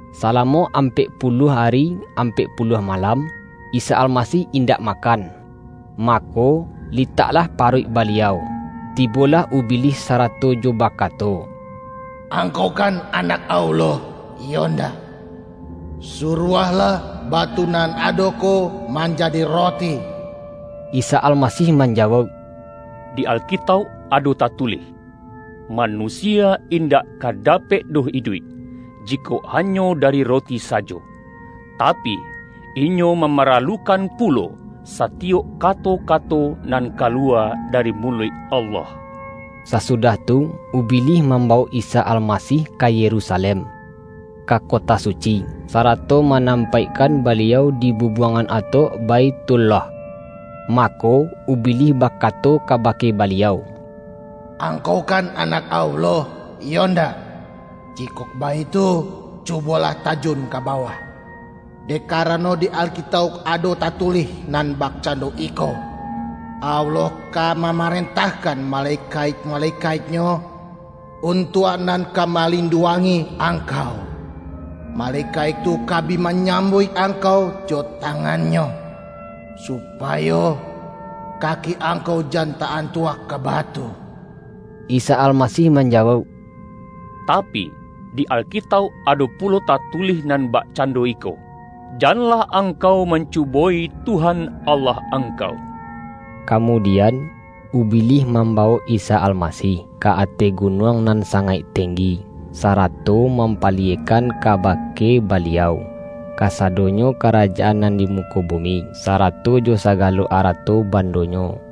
Salamo ampek puluah ari ampek puluah ma-lam, Isa Almasih indak makan. Ma-ko, litaklah paruik Baliau. Tibolah Ubilih sarato jo bakato,”Angkau kan Anak Allah, iyo ndak? Suruahlah ba-tu nan ado ko manjadi roti.” Isa Almasih manjawauk,”Di Alkitauk ado tatulih: Manusia indak ka dapek doh iduik, jikok hanyo dari roti sajo, tapi, inyo mamaralukan pu-lo, satiyok kato-kato nan kaluwa da-ri muluik Allah.” Sasudah tu, Ubilih mambawok Isa Almasih ka Yerusalem, ka kota su-ci, sarato manampaikkan Baliau di bubuangan atok Baithullah. Mako, Ubilih bakato kabake Baliau,”Ang-kau kan Anak Allah, iyo ndak? Jikok baitu, cubolah tajun ka bawah, dek karano di Alkitauk ado tatulih nan bakcando iko, Allah ka mamarentahkan malekaik-malekaik-Nyo, untuak nan ka malinduangi Angkau, malekaik tu ka bi manyambuik Angkau jo tangannyo, supayo kaki Angkau jan ta-antuak ka batu.’” Isa Almasih manjawauk,”Tapi, di Alkitauk ado pulo tatulih nan bak-cando iko, ’Janlah angkau mancubo-i Tuhan Allah angkau.’” Kamudian, Ubilih mambawok Isa Almasih, ka ateh gunuang nan sangaik tenggi, sarato mampaliyekkan kaba-ke Baliau, kasadonyo karajaan nan di muko bumi, sarato jo sagalo arato bandonyo.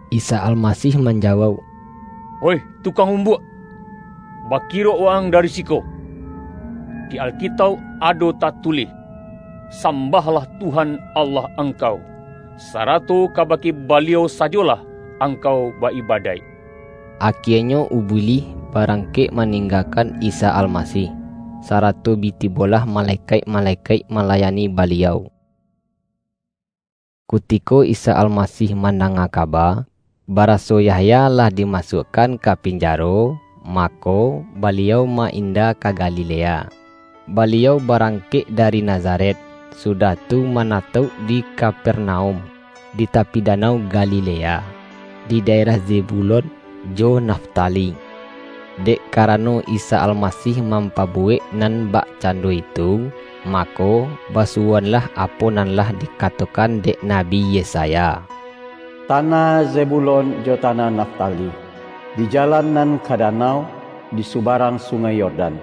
Isa Almasih manjawauk,”Oih Tu-kang Umbuak! Bakirok wa-ang dari si-ko! Di Alkitauk ado tatulih: Sambahlah Tuhan, Allah angkau, sarato kabake Baliau sajolah angkau ba-ibadaik!” Akienyo Ubilih barangkek ma-ninggakan Isa Almasih, sarato bi ti-bolah malekaik-malekaik malayani Baliau. Kutiko Isa Almasih mandanga ka-ba, baraso Yahya lah dimasuakkan ka pinjaro, mako, Baliau ma-inda ka Galilea. Baliau barangkek dari Nazaret, sudah tu manatauk di Kapernaum, di tapi Danau Galilea, di daerah Zebu-lon jo Naftali. Dek karano Isa Almasih mampa-buwek nan bakcando itu, mako, ba-suwoanlah apo nan lah dikatokan dek Nabi Yesaya: ”Tanah Zebulon jo tanah Naftali, di jalan nan ka danau, di subarang Sungai Yordan,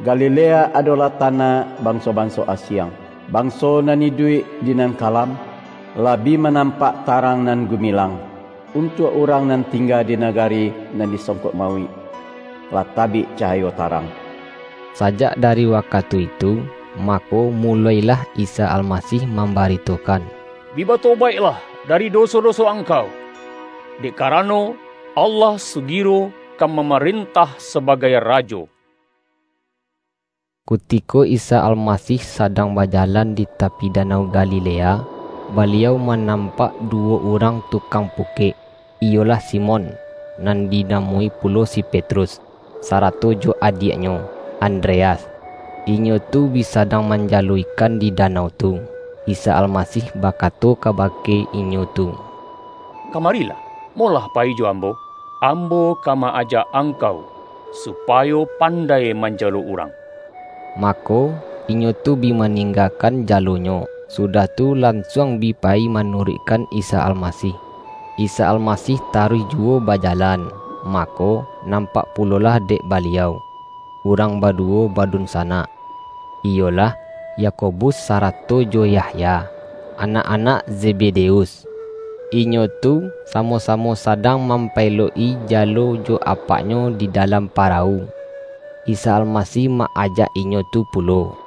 Galilea adolah tanah banso-banso asiang! Banso nan iduik di nan kalam, lah bi manampak tarang nan gumilang! Untuak urang nan tingga di nagari nan disongkok mauik, lah tabik cahayo tarang!” Sajak dari wakatu itu, mako mu-lo-ilah Isa Almasih mambaritokan,”Bi batobaiklah dari doso-doso ang-kau, dek karano, Allah sugiro ka ma-marentah sabagai Rajo!” Kutiko Isa Almasih sadang baja-lan di tapi Danau Galilea, Baliau ma-nampak duwo urang tukang pukek, iyolah Simon, (nan dinamoi pulo si Petrus,) sarato jo adiaknyo, Andreas. Inyo tu bi sadang manjalo ikan di da-nau tu. Isa Almasih bakato kabake inyo tu,”Kamarilah, molah payi jo Ambo. Ambo ka ma-aja angkau, supayo pan-dai manjalo urang.” Mako, inyo tu bi maninggakan jalonyo, sudah tu, lansuang bi payi manuruikkan Isa Almasih. Isa Almasih taruih juwo bajalan, mako, nampak pulolah dek Baliau, urang baduwo badunsanak, iyolah, Yakobus sarato jo Yahya, anak-anak Zebedeus. Inyo tu, samo-samo sadang mampaelok-i jalo jo apaknyo di dalam parawu. Isa Almasih ma-ajak inyo tu pulo,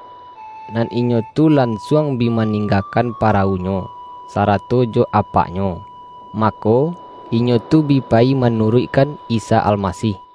nan inyo tu lansuang bi ma-ninggakan parawunyo, sarato jo apak-nyo, mako, inyo tu bi payi manuruik-kan Isa Almasih.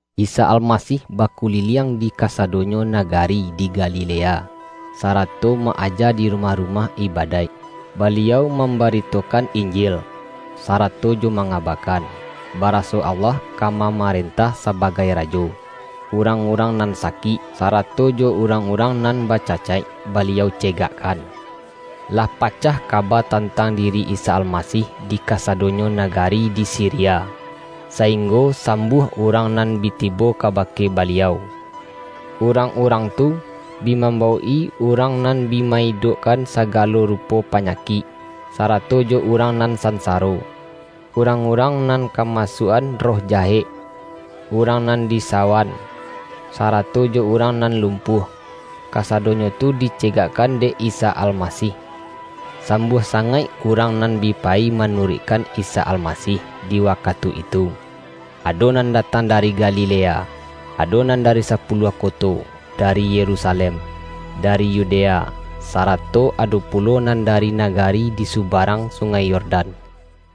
Isa Almasih bakuliliang di kasa-donyo nagari di Galilea, sarato ma-aja di rumah-rumah ibadaik. Baliau mam-baritokan Injil, sarato jo mangabakan, baraso Allah ka mamarentah sabagai Rajo. Urang-urang nan sakik, sarato jo urang-urang nan bacacaik, Baliau cegakkan. Lah pacah kaba tantang diri Isa Almasih di kasadonyo nagari di Siria, sainggo sambuah urang nan bi tibo kabake Baliau. Urang-urang tu, bi mambawok-i urang nan bi ma-idok-kan sagalo rupo panyakik, sarato jo urang nan sansaro. Urang-urang nan kamasuak-an roh jahek, urang nan di-sawan, sarato jo urang nan lumpuah, kasadonyo tu dicegakkan dek Isa Almasih. Sambuah sangaik urang nan bi payi manuruikkan Isa Almasih di wakatu itu. Ado nan datang dari Galilea, ado nan dari Sapuluah Ko-to, dari Yerusalem, dari Yudea, sara-to ado pulo nan dari nagari di suba-rang Sungai Yordan.